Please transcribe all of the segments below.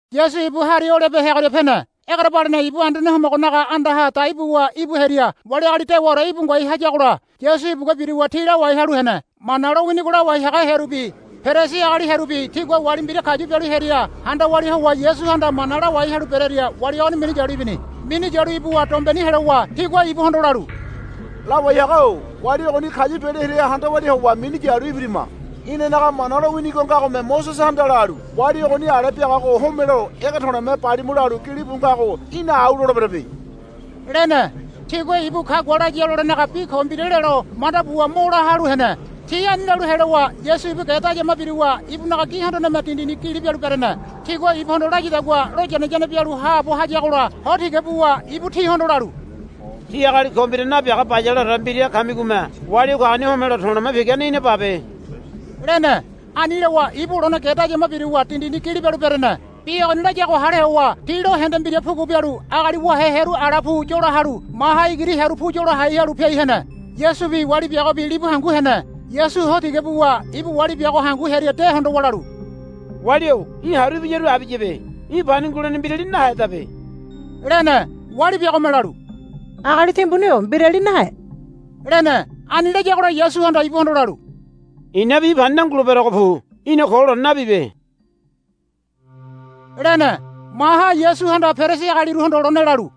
Yasu ibu Hari Olibe heagoria pene. Egerebalene ibu Anduane Homogonaga andaha dai buwa ibu hearia wali agali dewaore íbu ngoai hayagola Yasu ibugua biruwa ti lawai halu hene. Mana lowinigo lawai haga hearubi Perisi agali hearubi tigua wali mbira kayu bialu hearia handa walia howa Yasuhanda mana lawai halu berearia wali ogoni minu yalu ibini. Minu yalu ibuwa dombeni helowa tigua ibuhondo lalu, Lawai haga-o wali ogoni kayu bialu hearia handa walia howa minu yalu ibirima. Inanaga Mana lowinigo ngagome, Mosesehanda lalu, Wali ogoni ale biagago homelo ege to̱le̱me balimu, lalu gilibu ngago í̠na au loleberebe, lene. Tigua ibu kagua laya lolenaga bi ko mbira lelo manda buwa mo la halu hene. Ti ani lalu helowa Yasu ibu ge dayama biruwa ibunaga gi hondoneme dindini gili bialu berene. Tigua ibuhondo layadagua loyane yane bialu haabo hayagola ho tiga buwa ibu tihondo lalu, Tí agali ko mbira nabiaga bayaleore mbira kamigome wali o kagoni homelo to̱le̱ pigane í̠na babe, lene. Ani lowa ibu lone ge dayama biruwa dindini gili bialu berene. Bi ogoni layago hale howa ti lo hende mbira pugu bialu agali wahe hearu ala pu yola halu maha igiri hearu pu yola hai halu piai hene. Yasubi wali biagobi libu hangu hene. Yasu ho tiga buwa ibu wali biago hangu hearia de hondowa lalu, Wali-o í̠ haru ibiyaru abiyabe. Í̠ pani ngulene mbirali nahedabe, lene. Wali biagome lalu, Agali timbuni-o mbirali nahe, lene. Ani layagola Yasuhanda ibuhondo lalu, I̱nabi í̠ pani nanguleberogo pu. Í̠na ko lone nabibe, lene.] Maha Yasuhanda Perisi agaliruhondo lone lalu,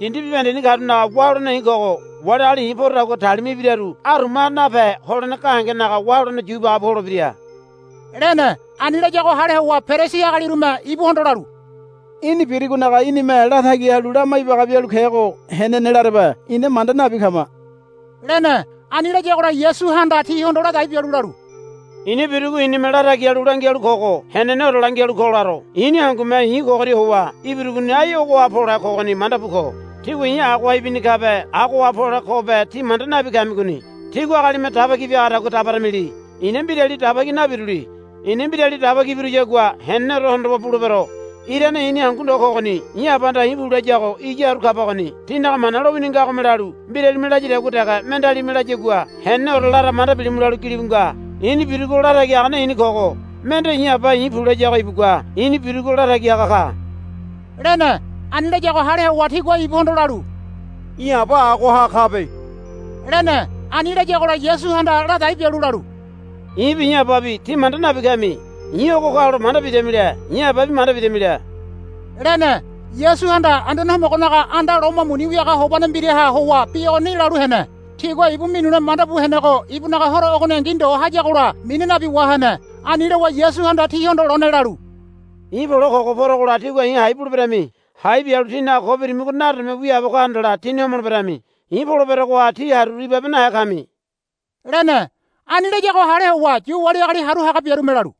Dindi bibahendeni karunaga wá holene i̱ kogo. Wali agali i̱ porodagua talima ibiraru arumaha nape holene gahengenaga wá holene yu ibaga bu holebira, lene. Ani layago hale howa Perisi agalirume ibuhondo lalu, Í̠ni birigonaga í̠nime latagi halu lama ibaga bialu kego henene larebe ina manda nabi kama, lene. Ani layagola Yasuhanda tihondo ladai bialu lalu, I̱na birugo i̱nime latagi halu langialu kogo heneneore langialu ko laro. I̱ni hangume i̱ ogoria howa ibirugoni ai ogoha pole kogoni manda bu ko. Tígua i̱ agoha howa ibini kabe agoha pole kobe tí manda nabi kamigoni. Tígua agalime daba ki biagadagua beramili. I̱na mbirali daba ki nabiruli. I̱na mbirali daba ki biruyagua heneneore hondowa bulebero. Irane i̱ni hangu ndo kogoni. I̱ Abahanda i̱ pu layago iya haru kabagoni. Tínaga Mana lowini ngagome lalu, Mbiralime layadagua dege mendealime layagua heneneore lara manda bilimu, lalu gilibu nga. I̱ni birugo latagi hagane i̱ni kogo. Mende i̱ Aba i̱ pu layago ibugua i̱ni birugo latagi haga ka, lene. Ani layago hale howa tigua ibuhondo lalu, Í̠ Aba agoha kabe, lene. Ani layagola Yasuhanda ladai bialu lalu, I̱bi i̱ Ababi tí manda nabi kami. I̱ ogo kalo manda bidamile i̱ Ababi manda bidamile, lene. Yasuhanda Anduane Homogonaga anda loma muni wiaga hobane mbiraha howa bi ogoni lalu hene. Tigua ibu minule manda bu henego ibunaga horo ogoningi ndo hayagola mina nabi wahene. Ani lowa Yasuhanda tihondo lone lalu, I̱ pole kogo porogola tígua i̱ hai buleberami. Hai bialu tínaga ko birimigo nadome wiaabo ka handala tíni homoleberami. I̱ poleberogoha tí haruru naibabehe kami, lene. Ani layago hale howa Yu wali agali haru haga biarume lalu,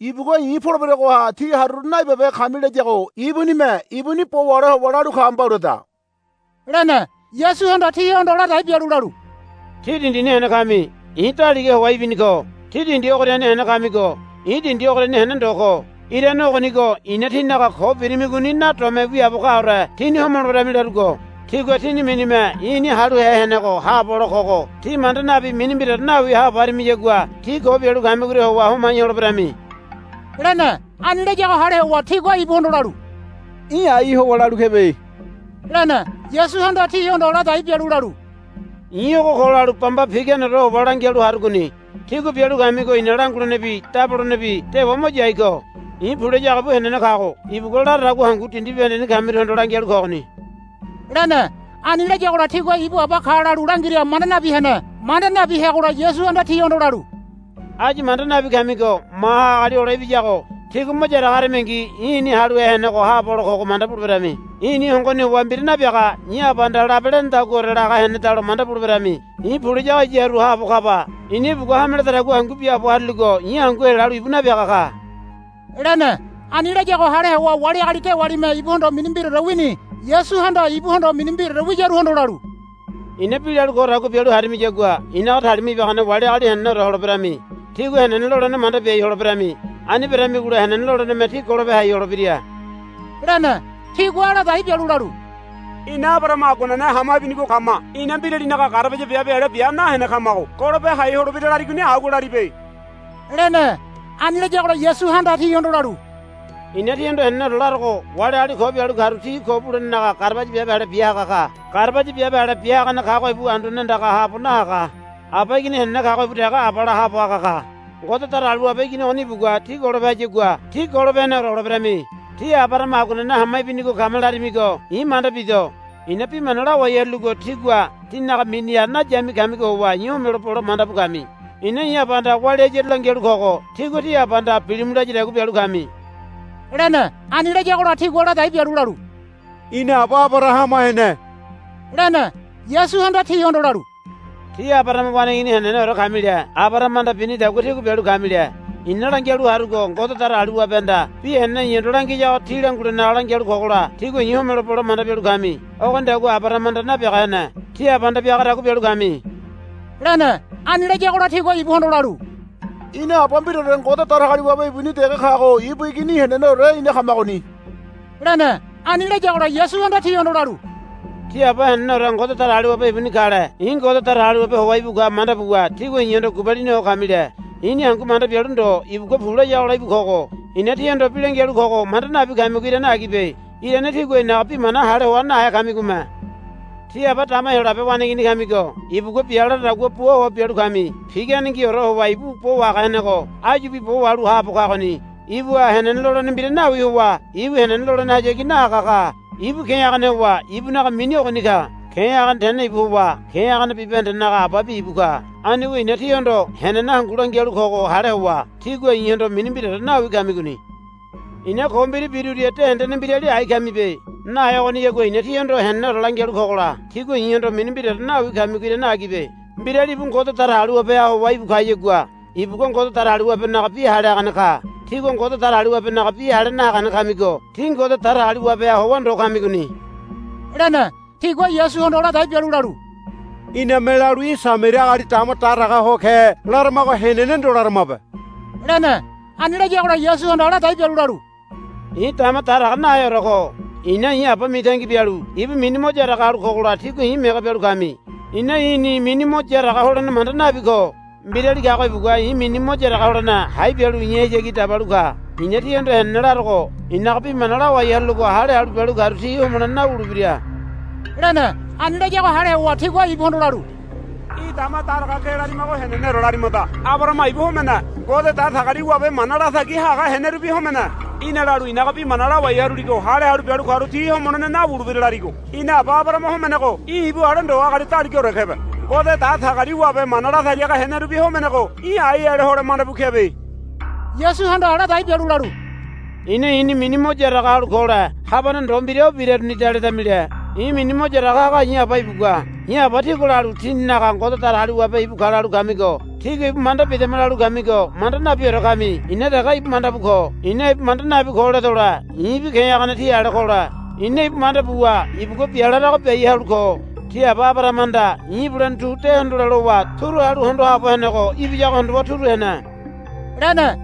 Ibugua i̱ poleberogoha tí haruru naibabehe kami layago ibunime ibuni bo wahole howa lalu ka mbauleda, lene. Yasuhanda tihondo ladai bialu lalu, Tí dindini hene kami. I̱ daliga howa ibini ko. Tí dindi ogoriani hene kamigo i̱ dindi ogoriani hene ndo ko. Irane ogonigo i̱na tínaga ko birimigoni nadome wiaabo kaore tíni homoleberemi larugo. Tígua tíni minime I̱ I̱ni Haluhe Henego Haabo Hole Kogo tí manda nabi mini mbiraore nawi haabo harimiyagua tí ko bialu kamigoria howa homai holeberami, lene. Ani layago hale howa tigua ibuhondo lalu, Í̠ ai howa lalu kebe, lene. Yasuhanda tihondo ladai bialu lalu, I̱ ogo ko lalu bamba piganeore howa langialu harugoni. Tígua bialu kamigo i̱na langulenebi dabolenebi dewa mo yai ko. I̱ pu layago ibu henene kago ibugua la laradagua hangu dindi bibahendeni kamiruhondo langialu kogoni, lene. Ani layagola tigua ibu Aba ka lalu langira manda nabi hene. Manda nabi heagola Yasuhanda tihondo lalu, Áyu manda nabi kamigo maha Agali Hole Ibiyago tígua mo yaraga haramingi I̱ I̱ni Haluhe Henego Haabo Hole Kogo manda buleberami. I̱ni hongoni howa mbira nabiaga i̱ Abahanda labe lenedaguaore laga henedalo manda buleberami. I̱ pu layago iya haru haabo kaba. I̱na ibugua hameledadagua hangu biaabo haruligo i̱ hangu helalu ibu napiaga ka, lene. Ani layago hale howa wali agali dewalime ibuhondo mini mbiraore wini. Yasuhanda ibuhondo mini mbiraore wiyaruhondo lalu, I̱na bi lalu kodagua bialu harimiyagua i̱naga talima ibagane wali agali heneneore holeberemi. Tígua henene lolene manda biai holeberami. Ani beramigola henene loleneme tí golope hai holebira, lene. Tigua ladai bialu lalu, Ina Abarahama aguanene hama ibinigo kama. Ina mbiralinaga garabaya biabe ale bia nahene kamago golope hai holebira larigoni agua laribe, lene. Ani layagola Yasuhanda tihondo lalu, I̱na tíhondo heneneore larogo. Wali agali ko bialu karu ti ko bulenenaga garabaya biabe ale bia haga ka. Garabaya biabe ale bia hagane kago ibu anduane andaga haabo nahaga. Aba igini henene kago ibu dege abala haabo haga ka. Ngode Datagaliwabe igini ogoni ibugua tí golope hayagua tí golope heneore holeberami. Tí Abarahama aguanene hama ibinigo kama larimigo i̱ manda bido. I̱na bi mana lawai haruligo tígua tínaga miniha nayami kamigo howa i̱ homelo bole manda bu kami. I̱na i̱ Abahanda walia hayaru langialu kogo tígua tí abahanda bilimu layadagua bialu kami, lene. Ani layagola tigua ladai bialu lalu, Ina aba Abarahama hene, lene. Yasuhanda tihondo lalu, Tí Abarahama waneigini heneneore kamile Abarahamahanda binidagua tígua bialu kamile. I̱na langialu harugo Ngode Datagaliwabehanda bi henene i̱hondo langiyago tí langulenaga lalu kogola tígua i̱ homelo bole manda bialu kami. Ogonidagua Abarahamahanda nabiaga hene. Tí abahanda biagadagua bialu kami, lene. Ani layagola tigua ibuhondo lalu, Ina Aba mbiraore Ngode Datagaliwabe ibuni dege kago ibu igini heneneore ina kamagoni, lene. Ani layagola Yasuhanda tihondo lalu, Tí Aba heneneore Ngode Datagaliwabe ibuni kale i̱ Ngode Datagaliwabe howa íbu ka manda buwa tígua i̱hondo gubalini ho kamile. I̱ni hangu manda bialu ndo ibugua pu layagola íbu kogo. I̱na tíhondo bi langialu kogo manda nabi kamigo irane agibe. Irane tígua i̱naga bi mana hale hoa nahe kamigome. Tí aba dama Heyolabe waneigini kamigo ibugua bia laradagua bua howa bialu kami. Piganengiore howa ibu bo wahaga henego áyubi bo wahalu haabo kagoni. Ibuha henene lolene mbira nawi howa ibu henene lolenehayagi nahaga ka. Ibu ke̱ hagane howa ibunaga mini ogoni ka. Ke̱ hagane tene ibu howa ke̱ hagane bibahendenaga ababi ibu ka. Anigo i̱na tíhondo henene hangu langialu kogo hale howa tígua i̱hondo mini mbiraore nawi kamigoni. I̱na ko mbira biruria de hendene mbirali ai kamibe. Nahe ogoniyagua i̱na tíhondo heneneore langialu kogola tígua i̱hondo mini mbiraore nawi kamigo irane agibe. Mbirali ibu Ngode Datagaliwabeha howa íbu kayagua ibugua Ngode Datagaliwabenaga bi hale hagane ka. Tígua Ngode Datagaliwabenaga bi hale nahagane kamigo tí Ngode Datagaliwabeha howa ndo kamigoni, lene. Tigua Yasuhondo ladai bialu lalu, Iname lalu í̠ Samaria agali dama daraga ho ke laramago henene ndo laramabe, lene. Ani layagola Yasuhanda ladai bialu lalu, I̱ dama daraga naheore ko. I̱na i̱ Aba mitangi bialu ibu mini mo yaraga halu kogola tígua i̱ mege bialu kami. I̱na i̱ni mini mo yaraga holene manda nabi ko. Mbirali kago ibugua i̱ mini mo yaraga holene hai bialu i̱hayagi dabalu ka. I̱na tíhondo henene larogo. I̱naga bi mana lawai haruligo hale halu bialu karu ti homolene nawulebira, lene. Ani layago hale howa tigua ibuhondo lalu, Í̠ dama daraga ke larimago heneneore larimada. Abarahama ibu homene. Ngode Datagaliwabe mana latagi haga henerubi homene. Í̠na lalu i̱naga bi mana lawai haruligo hale halu bialu karu ti homolene nawulebira larigo. Ina aba Abarahama homenego í̠ ibu ale ndo í̠ agali daligaore kebe. Ngode Datagaliwabe mana latagi haga henerubi homenego í̠ ai ale hole manda bu kebe. Yasuhanda ladai bialu lalu, I̱na i̱ni mini mo yaraga halu kole habane ndo mbira o birarunida ledamile. I̱ mini mo yaraga haga i̱ Aba ibugua. I̱ Aba tígua lalu tíninaga Ngode Datagaliwabe ibu ka lalu kamigo. Tígua ibu manda bidama lalu kamigo manda nabiore kami. I̱na dege ibu manda bu ko. I̱na ibu manda nabi ko ledole i̱bi ke̱ hagane tí ale kole. I̱na ibu manda buwa ibugua bia larago biai halu ko. Tí aba Abarahamahanda i̱ ibulene tu de hondole lowa turu halu hondo haabo henego. Ibiyago hondowa turu hene, lene.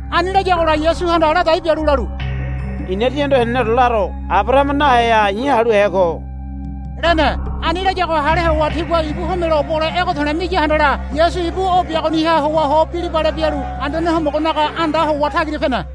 Ani layagola Yasuhanda ladai bialu lalu, I̱na tíhondo heneneore laro. Abarahama naheha I̱ Haluhe ko, lene. Ani layago hale howa tigua ibu homelo bole ege to̱le̱ miya handala Yasu ibu o biagoniha howa ho bilibale bialu Anduane Homogonaga anda howa tagira pene.